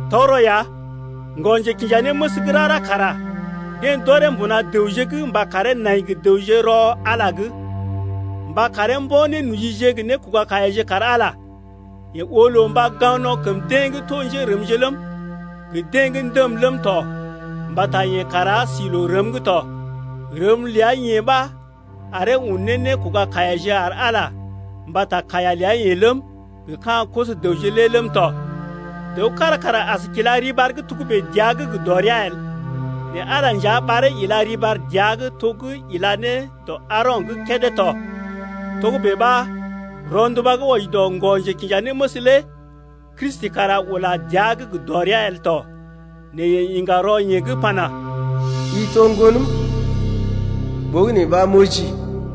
Tɔgərɔ ya, ŋgɔ-njekinjanéməs gə́ rara kara deḛ d’ɔree mbuna dəwje’g mba karee nai gə dəwje rɔ Ala’g, mba karee mbo̰ nénojije gə nékoga-kaiyaje kar Ala. Yeḛ oo loo mba gaŋg no̰ kəm deḛ gə́ to njérəmje ləm, gə deḛ gə́ ndəm ləm tɔ mbata yeḛ kara sí loo rəm’g tɔ. Rəm ləa-yeḛ ɓa aree un ne nékoga kaiyaje ar Ala mbata kaiya ləa-yeḛ ləm, gə ka̰ koso-dəwje lé ləm tɔ. Dəw kára kara as kila riɓar gə́ togə́bè dəa’g gə dɔrea el. Nɛ Ala nja ɓaree ila riɓar dəa’g to gə́ ila ne dɔ Aaro̰’g kédé tɔ. Togə́bè ɓa rɔnduba gə́ wɔji dɔ ŋgɔ-njekinjanéməs lé Kristi kara ula dəa’g gə dɔrea el tɔ. Nɛ yeḛ iŋga rɔ yeḛ gə́ pana: I to Ŋgonəm, ɓogənè ɓa m’ojii.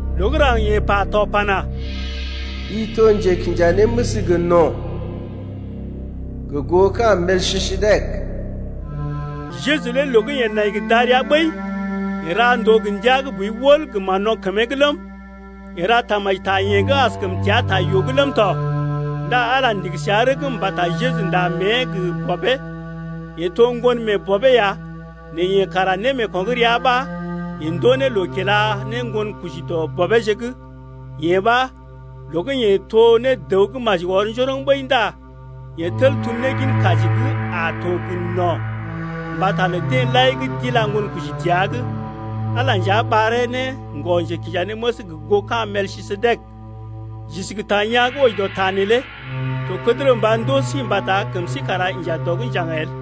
Loo gə́ raŋg yeḛ pa to pana: I to njekinjanéməs gə no̰, Gə goo ka̰ Melkisedek. Jeju lé loo gə́ yeḛ nai gə darəa ɓəi lé, yeḛ ra ndòo gə ndia gə́ boi wəl gə mán-no̰ kəmee’g ləm, yeḛ ra tamaji ta yeḛ gə́ askəm teá ta yoo’g ləm tɔ. Ndá Ala ndigi səa rəgm mbata Jeju nda mée gə bɔbee. Yeḛ to ŋgon mee bɔbee ya nɛ yeḛ kara némeeko̰ gə́ rəa ɓa yeḛ ndoo ne loo kila ne ŋgonkoji dɔ bɔbeeje’g. Yee ɓa, loo gə́ yeḛ to ne dəw gə́ maji ɔr njoroŋ ɓəi ndá yeḛ tel tum ne gin kaji gə́ a to gə no̰ mbata lə deḛ lai gə́ d’ila ŋgonkoji dəa’g lé. Ala nja ɓaree ne ŋgɔ-njekinjanéməs gə goo ka̰ Melkisedek. J’isi gə ta yaa̰ gə́ wɔji dɔ ta neelé, to kədərə mba ndoo sí mbata kəm sí kara inja dɔ’g njaŋg el.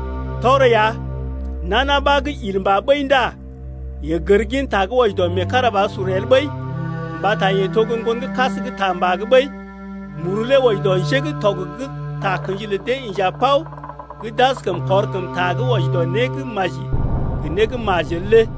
Tɔgərɔ ya nana ɓa gə́ il mbà ɓəi ndá yeḛ gər gin ta gə́ wɔji dɔ meekarabasur el ɓəi mbata yeḛ to gə́ ŋgonkas gə́ ta mbà’g ɓəi. Muru lé wɔji dɔ njé gə́ tɔg gə́ takə̰ji lə dee inja pao gə́ d’askəm kɔr kəmta gə́ wɔji dɔ né gə́ maji gə né gə́ majel lé.